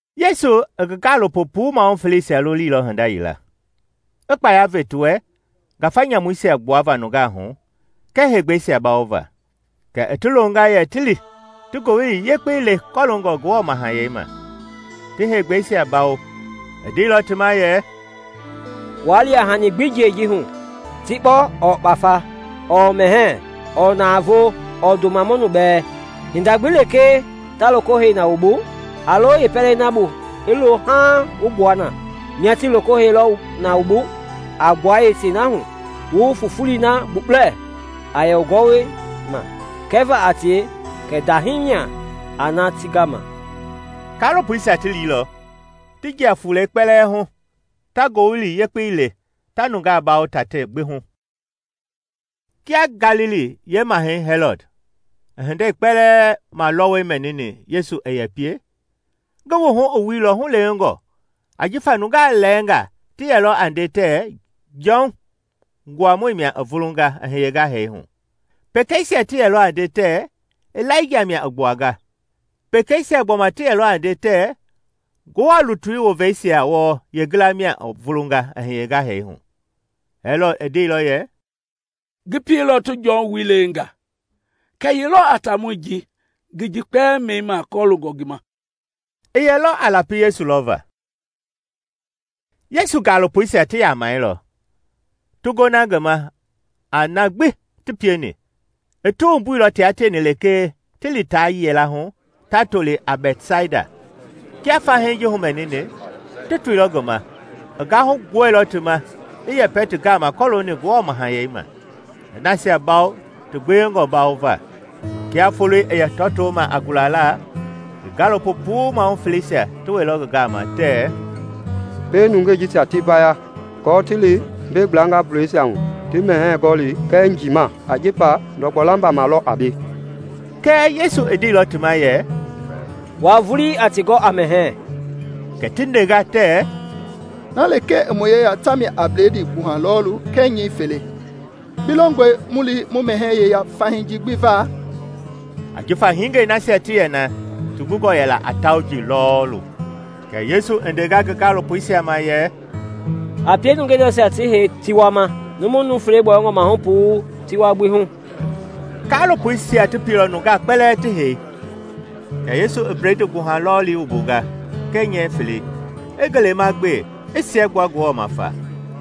Yesu i ngi gaalopo puu mahu feleisia lolilɔ hinda yila, i kpaya ve ti wɛ ngafa nyamuisia gbuava nungaa hu kɛɛ heegbɛisia bawova. Kɛ i ti longa yɛ ti li ti Ngowili Yekpei le kɔloongɔ Ngewɔ Mahayɛi ma, ti heegbɛisia bawo. I ndeilɔ ti ma yɛ, “Waa li a hani gbi jiɛi ji hu: tikpɔ ɔɔ kpafa ɔɔ mɛhɛɛ ɔɔ navoo ɔɔ ndoma mɔnu bɛɛ. Hinda gbi lekee ta loko hei na wu bu, a lo yeepɛlei na bu i lohu haaŋ wu gbua na; mia tii loko hei lɔ na wu bu a gbua yeetei na hu wu fufulei na gbukpulɛ a yɛ wu gɔwɔma kɛva a tie kɛ ndahii mia a na ti gama.” Kaalopoisia ti liilɔ, ti jia fulei kpelɛ hu, ta Ngowili Yekpei le, ta nungaa bawo tatei gbi hu. Kia Galili yeemahɛi, Hɛlɔd, i hindei kpɛlɛɛ malɔwɔi mɛnini Yesu i yɛ pie, ngi wuhu i wuilɔ hulewengɔ ajifa nungaa lɛɛnga ti yɛlɔ a nde tɛɛ Jɔn, Nguamɔi mia i vulunga i hiyenga hee hu. Pekeisia ti yɛlɔ a nde tɛɛ Ilaija mia i gbuanga; pekeisia gbɔma ti yɛlɔ a nde tɛɛ Ngewɔ lutui woveisia wɔɔ yeengila mia i vulunga i hiyenga hee hu. Hɛlɔd i ndeilɔ yɛ, “Ngi pieilɔ ti Jɔn wui lewenga; kɛɛ ye lɔ a taamɔi ji ngi ji kpɛlɛɛ mɛnima kɔloongɔ ngi ma?” I yɛlɔ a lapi Yesu lɔva. Yesu gaalopoisia ti yamɛilɔ, ti gona ngi ma a na gbi ti pieni. I ti wumbuilɔ tia tieni lekee ti li ta yilahu ta toli a Bɛtsaida. Kia fahii ji humɛnini, ti toilɔ ngi ma. I gahu gbuɛilɔ ti ma, i yɛpɛ ti gama kɔloongɔ Ngewɔ Mahayɛi ma, i nasia bawo ti gbewengɔ mbawo va. Kia foloi i yɛ tɔtoma a gulala, ngi gaalopo puu mahu feleisia ti wɛilɔ ngi gama tɛɛ, “Pie nungei jisia ti vaya aako ti li mbei gbla vulɛisia hu ti mɛhɛɛ gɔli kɛɛ njiima, ajifa ndɔgbɔ lamba ma lɔ a mbei.” Kɛɛ Yesu i ndeilɔ ti ma yɛ, “Wua vulii a ti gɔ a mɛhɛɛ.” Kɛ ti ndenga tɛɛ, “Na lekee i mu yeya ta mia a bledii gbuha lɔɔlu kɛɛ nyɛɛ fele. Bi longɔe mu li mu mɛhɛɛ yeya fahii ji gbi va?” Ajifa hingei nasia ti yɛ na ti gungɔ yɛla a tauji lɔɔlu. Kɛ Yesu i ndenga ngi gaalopoisia ma yɛ, “A pie nungeisia ti hei tiwa ma, numu nuu fele gbɔyɔngɔ mahu puu tiwa gbi hu.” Kaalopoisia ti pieilɔ nungaa kpɛlɛɛ ti hei. Kɛ Yesu i bledii gbuha lɔɔli wumbunga kɛɛ nyɛɛ felei, i ngelema gbe, i siɛgbua Ngewɔ ma fa,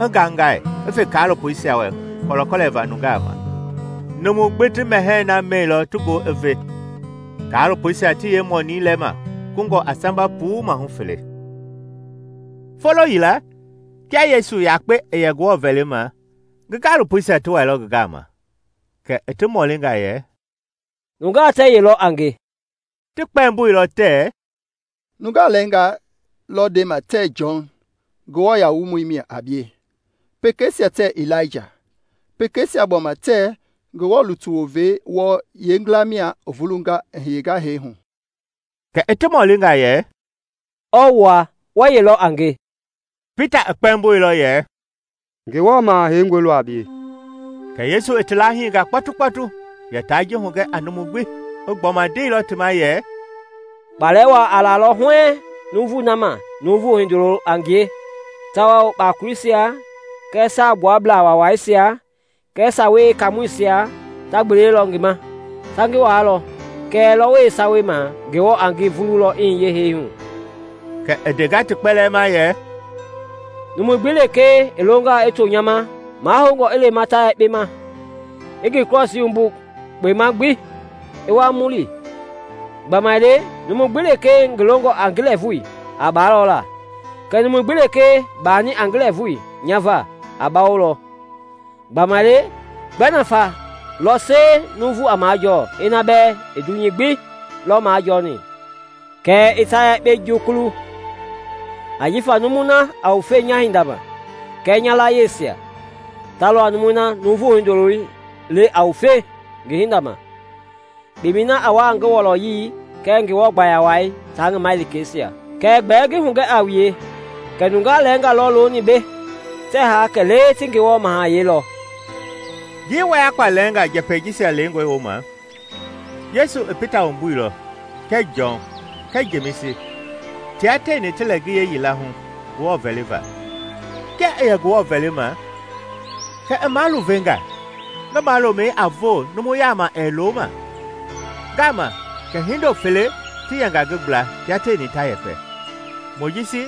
i ngaingai, i fe kaalopoisia wɛ kɔlɛkɔlɛva nungaa ma. Numu gbi ti mɛhɛɛi na mɛilɔ ti goo i ve, kaalopoisia ti yeemɔnii lɛma kungɔ a samba puu mahu fele. Folo yila, kia Yesu yakpe i yɛ Ngewɔ vɛlima, ngi gaalopoisia ti wailɔ ngi gama. Kɛ i ti mɔlinga yɛ, “Nungaa tɛɛ ye lɔ a nge?” Ti kpɛmboilɔ tɛɛ, “Nungaa lɛɛnga lɔ ndema tɛɛ Jɔn Nguamɔi lɔ a bie. Pekeisia tɛɛ Ilaija, pekeisia gbɔma tɛɛ Ngewɔ lutui woveisia wɔɔ yeengila mia i vulunga, i hiyenga hee hu.” Kɛ i ti mɔlinga yɛ, “Ɔɔ wua? Wɛɛ ye lɔ a nge?” Pita i kpɛmboilɔ yɛ, “Ngewɔ Maha Heingɔi lɔ a bie.” Kɛ Yesu i ti lahinga kpɔtukpɔtu yɛ ta ji hugɛ a numu gbi. I gbɔma ndeilɔ ti ma yɛ, “Kpalɛ wa a lalɔ huɛɛŋ numui na ma Nuuvu Hindoloi a ngie, tawao kpakoleisia kɛɛ Saagbuabla Waawaisia kɛɛ Sawei Yeekaamɔisia ta gbelelɔ ngi ma. Ta ngi waalɔ, kɛɛ lɔwɔi yeesawei ma Ngewɔ a ngi vululɔ i hiye hee hu.” Kɛ i ndenga ti kpɛlɛɛ ma yɛ, “Numu gbi lekee i longaa i to nya ma, mahoungɔ i lema ta yekpe ma, i ngi krɔsii wumbu kpema gbi, i wa mu li. Gbamaile numu gbi lekee ngi longɔ a ngi lɛɛvui, a baalɔ la; kɛɛ numui gbi lekee baani a ngi lɛɛvui nya va, a mabawolɔ. Gbamaile gbɛ nafa lɔ sie numu a majɔɔ ina bɛɛ i dunyei gbi lɔ majɔni kɛɛ i ta yekpe jukulu? Ajifa numui na a wufe nya hinda ma kɛɛ nya layiesia, ta lɔ numui na Nuuvu Hindoloi le a wufe ngi hinda ma kpemɛi na a wa a ngi wɔlɔyei kɛɛ Ngewɔ gbaya wai tia ngi malikeisia. Kɛɛ gbɛɛ ngi hugɛ a wue kɛ nungaa lɛɛnga lɔ looni mbei tɛɛ haa kɛlee ti Ngewɔ Mahayɛi lɔ.” Njii wayakpa lɛnga njɛpɛi jisia lengɔi wooma, Yesu i Pita wumbuilɔ kɛɛ Jɔn kɛɛ Jemisi tia tieni ti lɛ ngiye yila hu Ngewɔ vɛliva. Kia i yɛ Ngewɔ vɛlima, kɛ i maluvenga, ngi malomɛi a voo numu yama ɛɛ lo ma. Ngama kɛ hindo fele ti yɛnga ngi gbla tia tieni ta yɛpɛ. Mojisi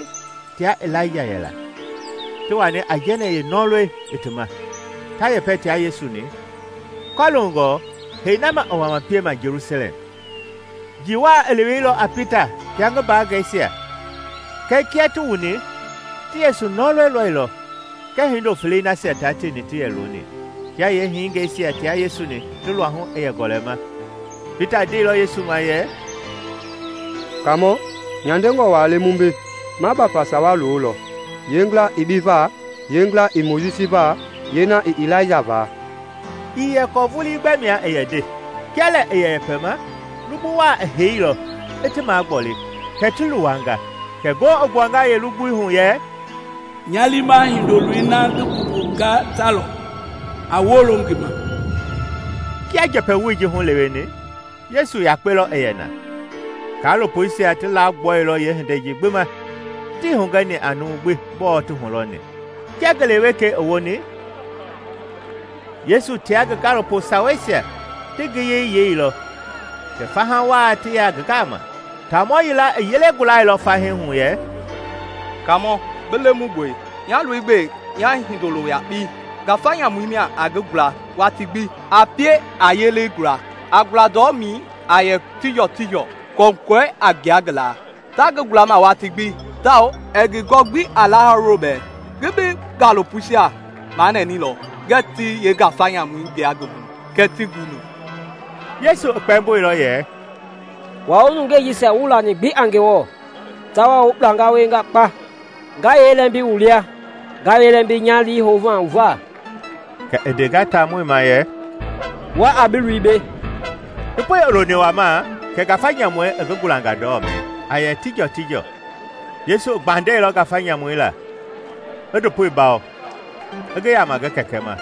tia Ilaija yɛla, ti wani aijɛnɛ yeenɔlɔi i ti ma, ta yɛpɛ tia Yesu-ni kɔloongɔ hee na ma i wama piema Jelusalɛm. Njii wa i leweilɔ a Pita tia ngi mbaangɛisia kɛɛ kia ti wuni ti Yesu nɔlɔi lɔilɔ kɛɛ hindo felei nasia tia tieni ti yɛ looni. Kia yeehingeisia tia Yesu-ni ti luahu i yɛ gɔlɛma, Pita ndeilɔ Yesu ma yɛ, “Kaamɔ, nyandengɔ wa le mu mbei! Ma bafa sawa lolɔ, yeengila i bi va, yeengila i Mojisi va, yeena i Ilaija va.” (ii yɛ kɔɔ vulii gbɛ mia i yɛ nde) Kia lɛ i yɛ yɛpɛma, lugbu wa i heilɔ, i ti magboli, kɛ ti luwanga. Kɛ ngoo i gbuanga yeelugbui hu yɛ, “Nya liima Hindoloi na ngi mbumbunga ta lɔ; a wolo ngi ma!” Kia njɛpɛ woi ji huleweni, Yesu yakpe lɔ i yɛ na. Kaalopoisia ti lagbɔilɔ yeehindei ji gbi ma, tii hugɛni a numu gbi gbɔɔ ti hulɔni. Kia ngele wekei i woni, Yesu tia ngi gaalopo saweisia ti ngiyei yeilɔ kɛ faha wa ti ya ngi gama. Taamɔ yila i yele gulailɔ fahii hu yɛ, “Kaamɔ! Bi lemungɔe, nya loi gbe nya hindolo yakpei! Ngafa nyamu mia a ngi gula watii gbi, a pie a yelei gula, a gula ndɔmɛi a yɛ tijɔtijɔ, kɔkɔɛi a gbua ngi la; ta ngi gulama watii gbi tawao ɛɛ ngi gɔ gbi a lahawulo bɛɛ. Ngi bi gaalopoisia manɛnɛilɔ ngɛɛ ti yeengafa nyamui gbua ngi hu, kɛɛ tii guni.” Yesu i kpɛmboilɔ yɛ, “Wua wu nungei jisia wuii lani gbi a Ngewɔ tawao wu kpulanga wienga kpa! Nga yee lɛmbi wu lia? Nga yee lɛmbi nya lii houma wu va?” Kɛ i ndenga taamɔi ma yɛ, “Wa a bi loi mbei.” Ndopoi i loni wamaa kɛ ngafa nyamui i ngi gulanga ndɔmɛi, a yɛ tijɔtijɔ. Yesu i gbandɛilɔ ngafa nyamui la, i ndopoi bawo, i ngi yama ngi kɛkɛ ma.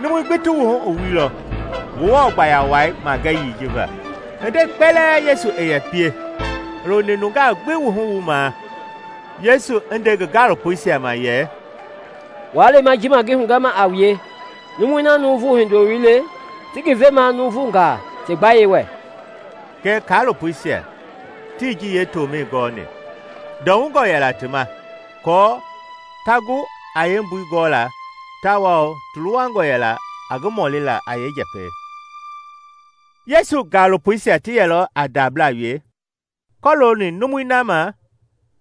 Numui gbi ti wuhu i wuilɔ Ngewɔ gbaya wai magɛyii ji va. Hindei kpɛlɛɛ Yesu i yɛ pie i loni nungaa gbi wuhu wuma Yesu i ndeni ngi gaalopoisia ma yɛ, “Wa lema ji ma ngi hugɛma a wue, numui na Nuuvu Hindoloi le, ti ngi vemaa nuuvunga ti gbayei wɛ.” Kɛɛ kaalopoisia tii ji yeetomɛi gɔni. Ndɔwungɔ yɛla ti ma aako ta gu a yeembui gɔla tawao ti luwangɔ yɛla a ngi mɔlila a yeenjɛpɛi. Yesu gaalopoisia ti yɛlɔ a ndabla wie kɔlooni numui na ma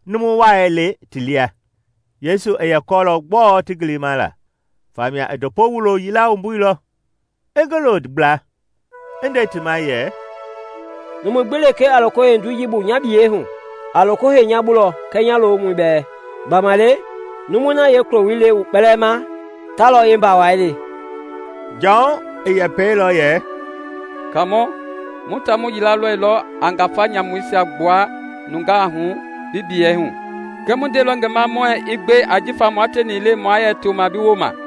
numu wai le ti lia. Yesu i yɛ kɔɔlɔ gbɔɔ ti gilima la, famia i ndopo wulo yila wumbuilɔ, i ngi lo gbla, i nde ti ma yɛ, “Numu gbi lekee a loko hei ndoi ji bu nya biyei hu, a loko hei nya lɔ bu kɛɛ nya lomɔi bɛɛ. Gbamaile numui na yeekuloi le wu kpɛlɛɛ ma, ta lɔ yeembawai le.” Jɔn i yɛpɛilɔ yɛ, “Kaamɔ, mu taamɔ yila lɔilɔ a ngafa nyamuisia gbua nungaa hu bi biyei hu, kɛɛ mu ndeilɔ ngi ma muɛɛ i gbe ajifa mua tieni ii le mua yɛ toma bi wooma.”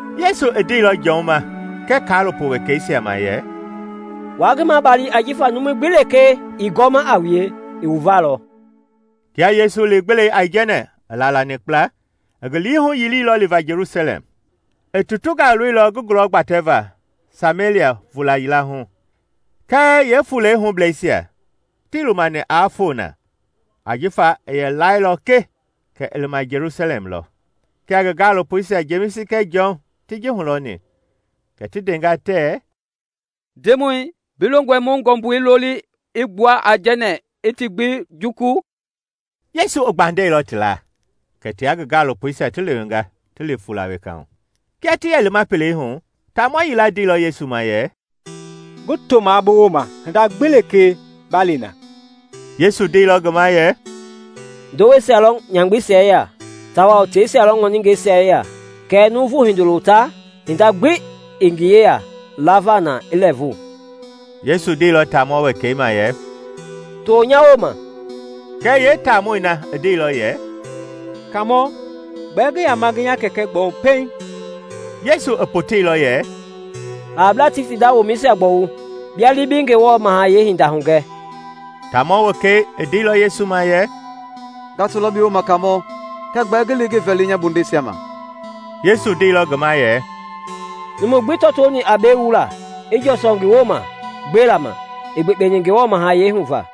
Yesu i ndeilɔ Jɔn ma kɛɛ kaalopo wekeisia ma yɛ, “Wa ngi mabali ajifa numu gbi lekee ii gɔma a wue i wu va lɔ.” Kia Yesu li-gbelei aijɛnɛ i laalani kpla, i ngi lii huyiliilɔ liva Jelusalɛm. I tutunga loilɔ ngi gulɔ gbatɛva Samelia vula yila hu; kɛɛ yeefulei hubleisia tii lumani aa foo na ajifa i yɛ lailɔ ke kɛ i lima Jelusalɛm lɔ. Kia ngi gaalopoisia, Jemisi kɛɛ Jɔn, ti ji hulɔni kɛ ti ndenga tɛɛ, “Ndemɔi, bi longɔe mu ngɔmbui loli i gbua aijɛnɛ i ti gbi jukulu?” Yesu i gbandɛilɔ ti la. Kɛ tia ngi gaalopoisia ti lewenga ti li fuula weka hu. Kia ti yɛ lima pelei hu, taamɔ yila ndeilɔ Yesu ma yɛ, “Ngi tomaa bi wooma hinda gbi lekee ba li na.” Yesu ndeilɔ ngi ma yɛ, “Ndoweisia lɔ nyamgbeisia yeya tawao teisia lɔ ŋɔningɛisia yeya, kɛɛ Nuuvu Hindoloi ta hinda gbi ii ngi yeya lava na i lɛɛvu.” Yesu ndeilɔ taamɔ wekei ma yɛ, “To nya wooma.” Kɛɛ yeetaamɔi na i ndeilɔ yɛ, “Kaamɔ, gbɛɛ ngi yama ngi nya kɛkɛ gbɔwu pɛiŋ.” Yesu i poteilɔ yɛ, “Hablaa ti ti nda womɛisia gbɔwu. Bia li bi Ngewɔ Mahayɛi hinda hugɛ.” Taamɔ wekei i ndeilɔ Yesu ma yɛ, “Nga tolɔ bi wooma Kaamɔ, kɛɛ gbɛɛ ngi li ngi vɛli nya bondeisia ma.” Yesu ndeilɔ ngi ma yɛ, “Numu gbii tɔtoni a mbei wula, i jɔsɔ ngi wooma gbela ma, ii gbekpeni Ngewɔ Mahayɛi hu va.”